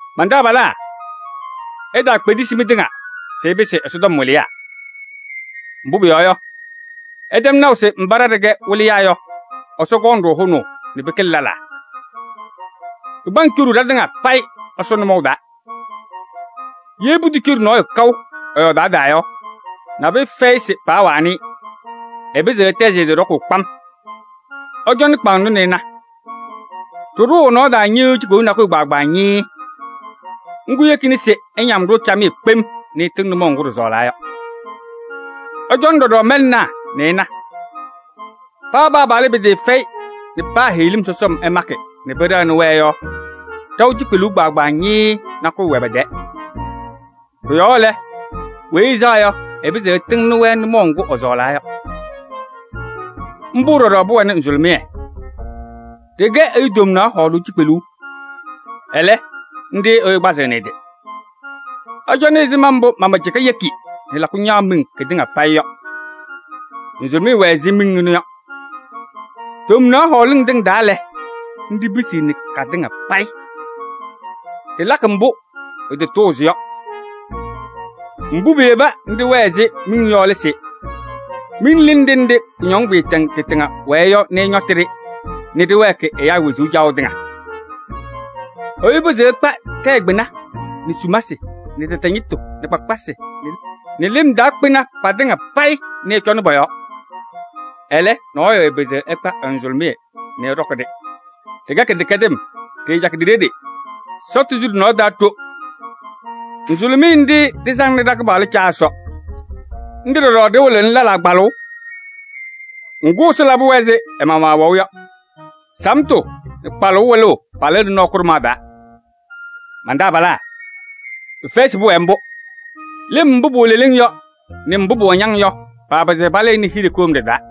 Man-taabalaa! Itaakpedesi mɩtɩŋa se ɩpɩsɩ Ɛsɔtɔm wɩlɩyaa. Mbʋ́ pʋyɔɔ yɔ, ɩtɛm naʋ se mbá ɖa ɖɩkɛ wɩlɩyaa yɔ, Ɛsɔ kɔŋ-ɖʋ hʋnaʋ nɛ pɩkɩlɩ lɛlaa. Pɩpaŋ coɖuu ɖatɩŋa payɩ Ɛsɔ nʋmɔʋ taa. Yee putocoɖi nɔɔyʋ kaʋ ɛ-yɔɔdaɣ taa yɔ, nabʋyʋ fɛyɩ se paawanɩ-ɩ. Ɛpɩzɩɣ ɛtɛzɩ ɛ-tɩ ɖɔkʋʋ kpam. Ɩcɔnɩ kpaŋnɔ nɛ ɩna: ɖɩɖʋʋ ɛ-nɔɔ taa ñɩ́ɣ́yʋ́ʋ cikpeluu nakʋyʋ kpaagbaa ñɩɩɩ. Ŋ́gʋ́ yekina se ɛñam-ɖʋ camɩyɛ kpem nɛ ɛtɩŋ nʋmɔʋ ŋgʋ́ ɖɩsɔɔlaa yɔ. Ɩcɔnɩ ɖɔɖɔ mɛlɛnaa nɛ ɩna: paa paapaɣlɩ pɩtɩɩfɛyɩ nɛ paa heɣlim sɔsɔm ɛmakɩ nɛ pɩɖɛɣnɩ-wɛ yɔ, ɖaʋ cikpeluu kpaagbaa ñɩɩɩ nakʋyʋ wɛ pɛ-tɛɛ. Kʋ-yɔɔ lɛ, weyi ɛsaɣ yɔ, ɛpɩzɩɣ ɛtɩŋnɩ-wɛ nʋmɔʋ ŋgʋ́ ɛsɔɔlaa yɔ. Ḿbʋ́ ɖɔɖɔ pʋwɛnɩ nzʋlʋmɩyɛ, ɖɩkɛ ɛyʋ tomnaɣ hɔɔlʋʋ cikpeluu, ɛlɛ́, ńɖɩ́ ɛyʋ kpazɩɣnɩ ɛ-tɩ. Ɩcɔnɩ ɛzɩma mbʋ́ mamacɩka yeki nɛ lakʋ ñaɣ miŋ kɩtɩŋa payɩ yɔ. Nzʋlʋmɩyɛ wɛ ɛzɩ miŋ ɛnʋ yɔ. Tomnaɣ hɔɔlɩŋ tɩŋa taa lɛ, ńɖɩ́ pisiɣni katɩŋa payɩ: ɖɩlakɩ mbʋ́ pɩtatʋʋzɩ yɔ. Mbʋ́ piyeba nɛ ɖɩwɛɛ ɛzɩ miŋ yɔ lɛ se: miŋ lɩnɩ ɖenɖe kʋñɔŋ maatɛŋ tɩtɩŋa wɛɛ yɔ nɛ ɛñɔtɩ-ɖɩ nɛ ɖɩwɛɛkɩ ɛyáa wezuu caɣʋ tɩŋa. Ɛyʋ pɩzɩɣ ɛkpa tɛyɛ kpɩna nɛ sumasɩ nɛ tɛtɛ ñɩtʋ nɛ kpakpasɩ nɛ lɩm taa kpɩna patɩŋa payɩ nɛ ɛcɔnɩ pɔ-yɔɔ. Ɛlɛ́, nɔɔyʋ ɛɛpɩzɩɣ ɛkpa ɛ-nzʋlʋmɩyɛ nɛ ɛ́ɖɔ́kɩ-ɖɩ: ɖɩkɛ kɩdɛkɛdɩm, ɖɩɩcakɩ ɖi-ɖeɖe, sɔtʋ su ɖɩ-nɔɔ taa ɖo. Nzʋlʋmɩyɛ ńɖɩ́ ɖɩsaŋnɩ ɖa-Kɩpaɣlʋ Caa Ɛsɔ. Ńɖɩ́ ɖɔɖɔ ɖɩwɩlɩɣnɩ lɛlaa kpalʋʋ, ŋgʋ́, Ɛsɔ labɩ-wɛ ɛzɩ ɛ-maɣmaɣ ɛwɛʋ yɔ: samtʋ nɛ kpalʋʋ wɩlʋʋ palɩɣnɩ nɔɔ kʋɖʋmaɣ taa. Man-taabalaa! Pɩfɛyɩ se pʋwɛɛ ḿbʋ́. Lɩm mbʋ́ pʋwɛ leleŋ yɔ nɛ mbʋ́ pʋwɛ ñaŋ yɔ paapɩzɩɣ palɩɩnɩ hiɖe kʋɖʋmɖɩyɛ taa.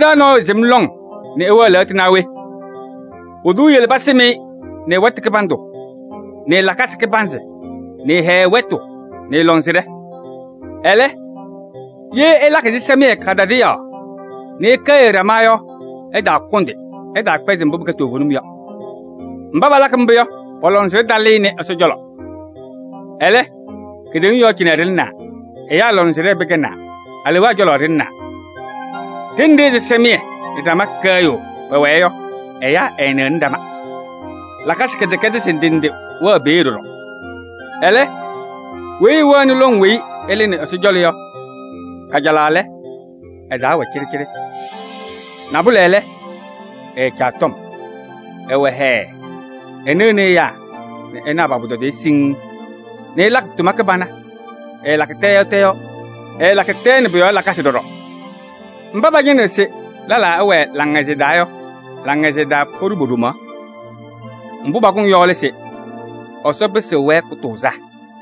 Mɩ-taa nɔɔyʋ sɩm lɔŋ nɛ ɛwɛɛ lɛɣtʋ naa we? Pʋdʋ eyele pasɩm-ɩ nɛ ɛ-wɛtʋ kɩbandʋ nɛ ɛ-lakasɩ kɩbanzɩ nɛ ɛ-hɛɛ wɛtʋ nɛ ɛ-lɔŋsɩnɖɛ. Ɛlɛ, ye ɩlakɩ ɛsɩsɛmɩyɛ kadadaɣyaɣ nɛ ɩkɛɣyɩɣ ɖama yɔ, ɩtaakʋndɩ, ɩtaakpɛzɩ mbʋ́ pɩkɛ toovenim yɔ. Mbá palakɩ ḿbʋ́ yɔ, pɔ-lɔŋsɩnɖɛ talɩɩnɩ Ɛsɔ cɔlɔ. Ɛlɛ́, kedeŋa yɔɔ cɩnɛ ɖɩlɩnaa, ɛyáa lɔŋsɩnɖɛ pɩkɛnaa, aleewaa cɔlɔ ɖɩlɩnaa. Đenɖe ɛsɩsɛmɩyɛ nɛ ɖama kɛɣyʋʋ pɛwɛɛ yɔ, ɛyáa ɛɛnɩɣnɩ ɖama. Lakasɩ kɩdɛkɛdɩsɩ ndɩ ndɩ wɛɣ peeɖe ɖɔɖɔ. Ɛlɛ́, weyi ɛwɛɣnɩ lɔŋ weyi ɛlɩnɩ Ɛsɔ cɔlɔ yɔ, kajalaɣ lɛ, ɛ-taa wɛ cɩɖɩcɩɖɩ. Nabʋlɛ lɛ, ɛɛcaɣ tɔm, ɛwɛ hɛɛ, ɛnɩɣnɩ ɛyáa nɛ ɛnaɣ pa-pʋtɔdɩyɛ siŋŋ nɛ ɛlakɩ tʋma kɩbana, ɛɛlakɩ tɛ yɔɔ tɛ yɔɔ, ɛɛlakɩ tɛɛ nɛ pʋ-yɔɔ lakasɩ ɖɔɖɔ. Mbá pañɩnɩɣ se lɛlaa ɛwɛɛ laŋhɛzɩyɛ taa yɔ, laŋhɛzɩyɛ taa poɖuu po-ɖomaɣ. Mbʋ́ pakʋŋ yɔ lɛ se Ɛsɔ pɩsɩɣ-wɛ kʋtʋʋzaa.